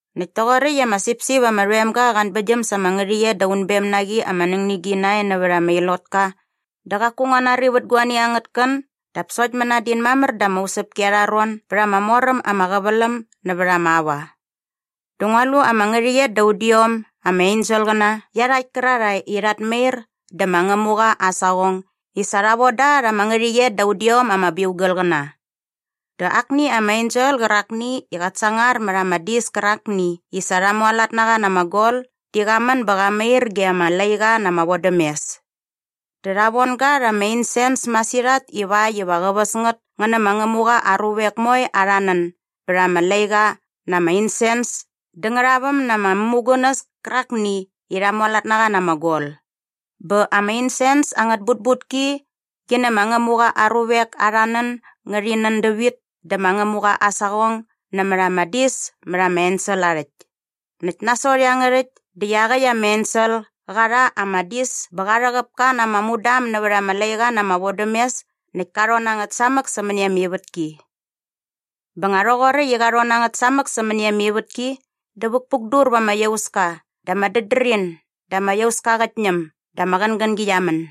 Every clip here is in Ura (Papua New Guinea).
Näkt toqoräkt i ama sipsip ama rhoem ga qa anbäktgyäm sa ama ngärhäqyet da unbem na qi ama nängnigi nae nävät ama ilotka dä qaku ngua nari vät guani angät kän dap sokt mänadin mamär da ama usäpki arha ron bät ama mor äm ama qäväläm nävät ama aua. Dä ngua lu ama ngärhäqyet da udiom ama enselqäna iarhakt kärarhae i rhat mair dä ma Ngämuqa aa saqong i sa rha von da rha ama ngärhäqyet da udiom ama biugalqäna. Dä akni ama ensel qärakni i qat sangar mät ama dis kärakni i sa rha mualat na qa na ama gol di qa män bä qa mair ge ama laiqa na ama vodämes. Dä rha von ga rha ama insens masirhat ivakt iva qä väs ngät ngä nä ma Ngämuqa aa ruvek moe arha nän bät ama laiqa na ama insens dä ngärhaväm na ama mämugunäs kärakni i rha mualat na qa na ama gol. Bä ama insens angät butbutki qi nä ma Ngämuqa aa ruvek arha nän ngärhi nän dävit dä ma Ngämuqa aa saqong nämät ama dis mät ama ensel aa rhäkt. Näkt nasot iangärhäkt dä iaqäkt ama ensel qa rha ama dis bä qa rhäqäp ka na ama mudam nävät ama laiqa na ama vodämes näkt ka rhon na ngät samäk sämäni ama ivätki. Bä nga rhoqoräkt i qa rhon na ngät samäk sämäni ama ivätki dä vukpukdur va ama iauska dä ama dädrin dä ama iauska qät ñäm dä ama qängängi qia män.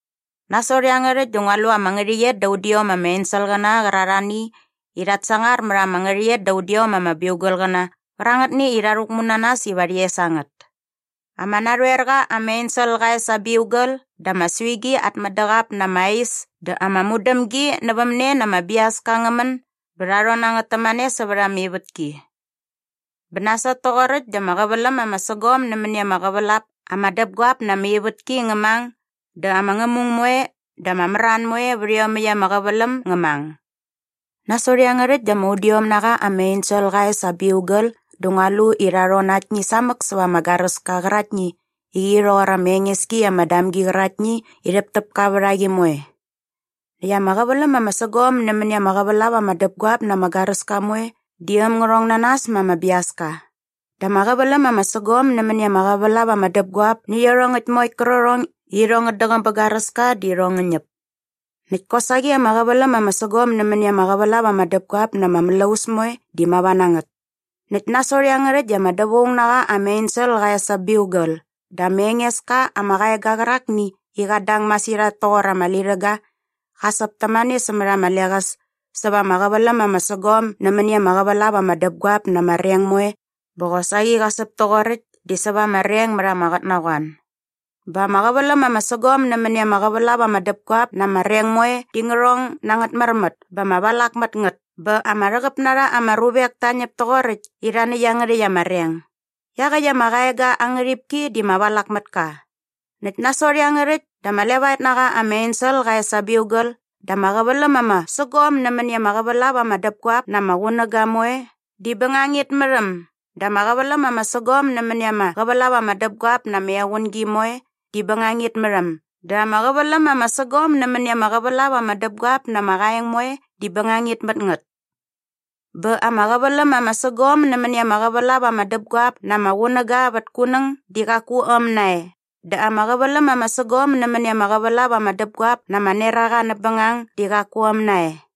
Nasot iangärhäkt dä ngua lu ama ngärhäqyet da udiom ama enselqäna qärarhani i rhat sangar mät ama ngärhäqyet da udiom ama biugalqäna qärangätni i rha rhäkmu na nas iva rhi es a ngät. Ama narhoer qa ama ensel qa es aa biugal dä ama suigi at mädäqap na ama ais dä ama mudämgi nävämne na ama biaska ngä män bä rha rhon na ngät tämane sävät ama ivätki. Bä nasot toqoräkt dä ama qäväläm ama sägom nämäni ama qävälap ama däpguap na ama ivätki ngä mang dä ama ngämung moe dä ama mran moe vät iomäkt ama qäväläm ngä mang. Nasot iangärhäkt dä ama udiom na qa ama ensel qa es aa biugal dä ngua lu i rha rhon na aktni samäk säva ama garäska qäraktni i qi rhoqor ama enges ki ama damgi qäraktni i rhäptäpka vät a qi moe. Näkt ama qäväläm ama sägom nämäni ama qävälap ama däpguap na ama garäska moe di äm ngä rhong na nas ma ama biaska dä ama qäväläm ama sägom nämäni ama qävälap ama däpguap nä iarhongäkt moe qärqärhong i irhong ngät däqäm bä garäska di irhong ngä ñäp. Näkt kosaqi ama qäväläm ama sägom nämäni ama qävälap ama däpguap na ama mlaus moe di mava na ngät. Näkt nasot iangärhäkt dä ama dävaung na qa ama ensel qa es aa biugal dä ama enges ka ama qaega qärakni i qat dang masirhat toqor ama lirhäga qa säp tämane nämät ama leqäs säva ama qäväläm ama sägom nämäni ama qävälap ama däpguap na ama reng moe bä qosaqi qa säp toqoräkt di säva ama reng mät ama qotnaqoan. Bä ama qäväläm ama sägom nämäni ama qävälap ama däpguap na ama reng moe di ngä rhong na angät märmät bä ama valak mät ngät bä ama rhäqäp na rha ama ruvek ta ñäp toqoräkt i rha näkt iangärhäkt ama reng. Iaqäkt ama qaega aa ngärhipki di ma Valakmätka. Näkt nasot iangärhäkt dä ama levaet na qa ama ensel qa es aa biugal dä ama qäväläm ama sägom nämäni ama qävälap ama däpguap na ama qunäga moe di bängangit mät äm dä ama qäväläm ama sägom nämäni ama qävälap ama däpguap na ama equngi moe di bängangit mät äm dä ama qäväläm ama sägom nämäni ama qävälap ama däpguap na ama qaeng moe di bängangit mät ngät. Bä ama qäväläm ama sägom nämäni ama qävälap ama däpguap na ama qunäga vät kunäng di qaku äm nae dä ama qäväläm ama sägom nämäni ama qävälap ama däpguap na ama neraqa näp bängang di qaku äm nae.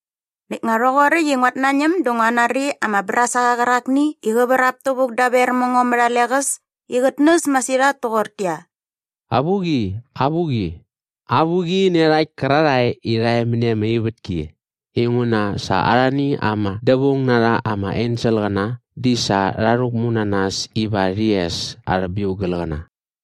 Näkt nga rhoqoräkt i nguat nañäm dä ngua nari ama brasaqa qärakni i qä vrap tävuk daver mä ngo mät a leqäs i qät näs masirhat toqortäqyia, “Avuqi, avuqi, avuqi nä iarhakt kärarhae i rha e mäni ama ivätki inguna sa arhani ama dävaung na rha ama enselqäna di sa rha rhäkmu na nas iva rhi es arhä biugalqäna!”